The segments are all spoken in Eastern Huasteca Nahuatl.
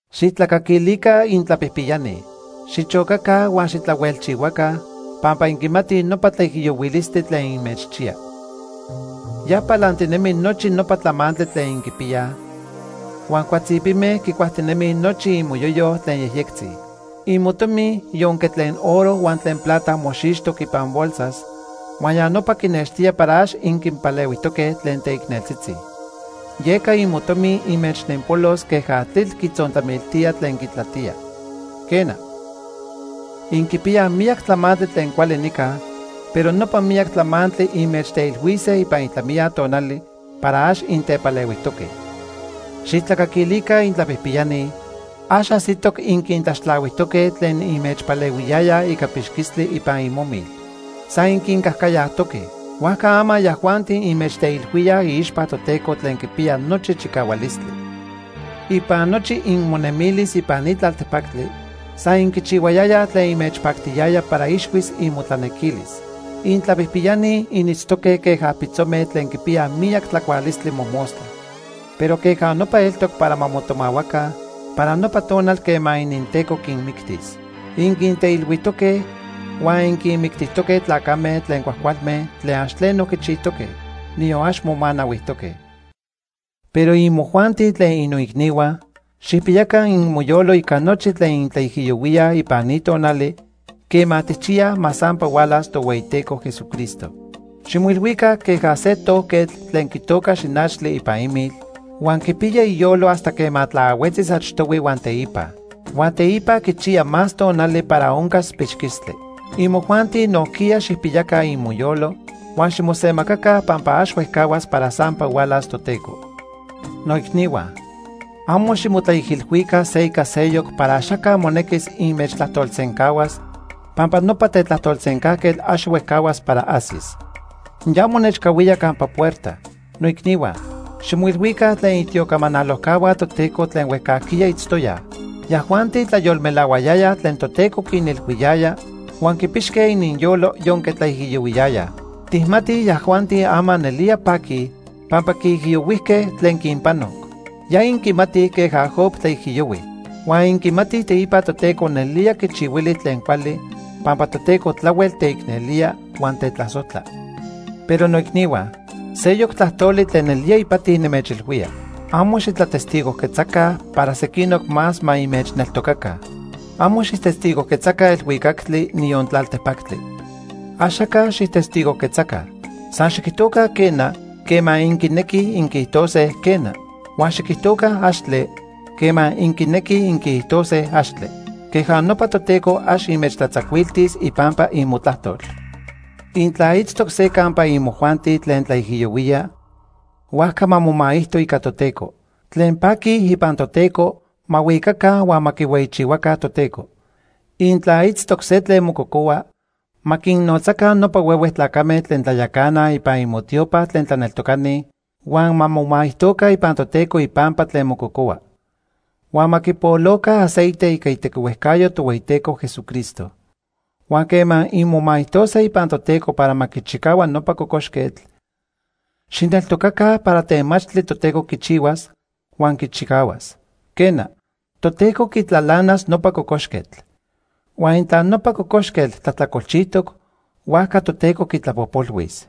Xijtlacaquilica intlapijpiyani. Xichocaca huan xitlahuelchihuaca pampa inquimatij nopa tlaijiyohuilistli tlen inmechchiya. Ya palantinemi nochi nopa tlamantli tlen inquipiyaj, huan cuatzipime quicuajtinemij nochi inmoyoyo tlen yejyectzi. Imotomi yonque tlen oro huan tlen plata moxixtoc ipan bolsas, huan ya nopa quinextía para ax inquinpalehuijtoque tlen teicneltzitzi. Yeca inmotomi inmechnenpolos queja tlitl quitzontlamiltía tlen quitlatía. Quena, inquipiyaj miyac tlamantli tlen cuali nica, pero nopa miyac tlamantli inmechteilhuise ipan itlamiya tonali para ax intepalehuijtoque. Xijtlacaquilica intlapijpiyani, ax ajsitoc inquintlaxtlahuijtoque tlen inmechpalehuiyayaj ica pixquistli ipan imomil. San inquincajcayajtoque. Huajca ama yajuanti inmechteilhuíaj iixpa Toteco tlen Quipiya Nochi Chicahualistli. Ipan nochi inmonemilis ipan ni tlaltepactli, san inquichihuayayaj tlen inmechpactiyaya para ixhuis inmotlanequilis. Intlapijpiyani initztoque queja pitzome tlen quipiyaj miyac tlacualistli mojmostla. Pero queja nopa eltoc para ma motomahuaca para nopa tonal quema ininteco quinmictis. Inquinteilhuijtoque huan inquinmictijtoque tlacame tlen cuajcualme tlen ax tleno quichijtoque, niyon ax momanahuijtoque. Pero imojuanti tlen innoicnihua, xijpiyaca inmoyolo ica nochi tlen intlaijiyohuíaj ipan ni tonali quema tijchiyaj ma sampa hualas Tohueyiteco Jesucristo. Ximoilhuica queja se tojquetl tlen quitoca xinachtli ipan imil, huan quipiya iyolo hasta quema tlaahuetzis achtohui huan teipa. Huan teipa quichiya más tonali para oncas pixquistli. Imojuanti nojquiya xijpiyaca inmoyolo huan ximosemacaca pampa ax huejcahuas para sampa hualas Toteco. Noicnihua, amo ximotlaijilhuica se ica seyoc para axaca monequis inmechtlajtolsencahuas, pampa nopa tetlajtolsencajquetl ax huejcahuas para ajsis. Ya monechcahuía campa puerta. Noicnihua, ximoilhuica tlen itiocamanalojcahua Toteco tlen huejcajquiya itztoyaj. Yajuanti tlayolmelahuayayaj tlen Toteco quinilhuiyaya huan quipixque ininyolo yonque tlaijiyohuiyayaj. Tijmatij yajuanti ama nelía paquij pampa quiijiyohuijque tlen quinpanoc. Ya inquimatij queja Job tlaijiyohui. Huan inquimatij teipa Toteco nelía quichihuili tlen cuali pampa Toteco tlahuel teicnelía huan tetlasojtla. Pero noicnihua, seyoc tlajtoli tlen nelía ipati nimechilhuía. Amo xitlatestigojquetzaca para sequinoc más ma inmechneltocaca. Amo xijtestigojquetzaca elhuicactli, niyon tlaltepactli. Axaca xijtestigojquetzaca. San xiquijtoca “quena” quema inquinequij inquiijtose, “quena”. Huan xiquijtoca “axtle” quema inquinequij inquiijtose “axtle”. Queja nopa Toteco ax inmechtlatzacuiltis ipampa inmotlajtol. Intla itztoc se campa imojuanti tlen tlaijiyohuía, huajca ma momaijto ica Toteco. Tlen paqui ipan Toteco, ma huicaca huan ma quihueyichihuaca Toteco. Intla itztoc se tlen mococohua, ma quinnotzaca nopa huehue tlacame tlen tlayacanaj ipan inmotiopa tlen tlaneltocani, huan ma momaijtoca ipan Toteco ipampa tlen mococohua. Huan ma quipoloca aceite ica itequihuejcayo Tohueyiteco Jesucristo. Huan quema inmomaijtose ipan Toteco para ma quichicahua nopa cocoxquetl, xijneltocaca para temachtli Toteco quichihuas, huan quichicahuas. Quena, Toteco quitlalanas nopa cocoxquetl. Huan intla nopa cocoxquetl tlajtlacolchijtoc, huajca Toteco quitlapojpolhuis.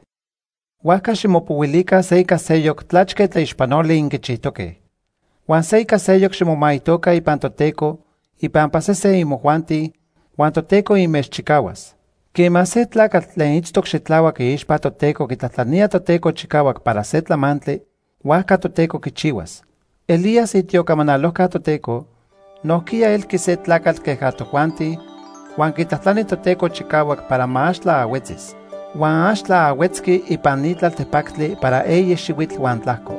Huajca ximopohuilica se ica seyoc tlachque tlaixpanoli inquichijtoque. Huan se ica seyoc ximomaijtoca ipan Toteco ipampa sesen imojuanti, huan Toteco inmechchicahuas. Quema se tlacatl tlen itztoc xitlahuac iixpa Toteco quitlajtlanía Toteco chicahuac para se tlamantli, huajca Toteco quichihuas. Elías, itiocamanalojca Toteco, nojquiya elqui se tlacatl queja tojuanti huan quitlajtlani Toteco chicahuac para ma ax tlaahuetzis. Huan ax tlaahuetzqui ipan ni tlaltepactli para eyi xihuitl huan tlajco.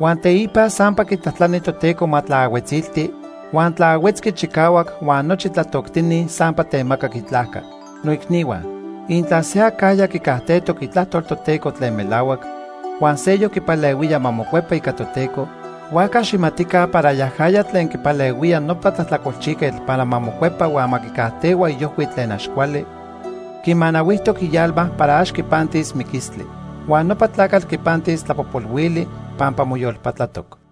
Huan teipa sampa quitlajtlani Toteco ma tlaahuetzilti, huan tlaahuetzqui chicahuac huan nochi tlatoctini sampa temacac itlajca. Noicnihua, intla se acajya quicajtejtoc Itlajtol Toteco tlen melahuac, huan seyoc quipalehuía ma mocuepa ica Toteco, huajca xijmatica para yajaya tlen quipalehuía nopa tlajtlacolchijquetl para ma mocuepa huan ma quicajtehua iojhui tlen ax cuali, quimanahuijtoc ialma para ax quipantis miquistli. Huan nopa tlacatl quipantis tlapojpolhuili pampa moyolpatlatoc.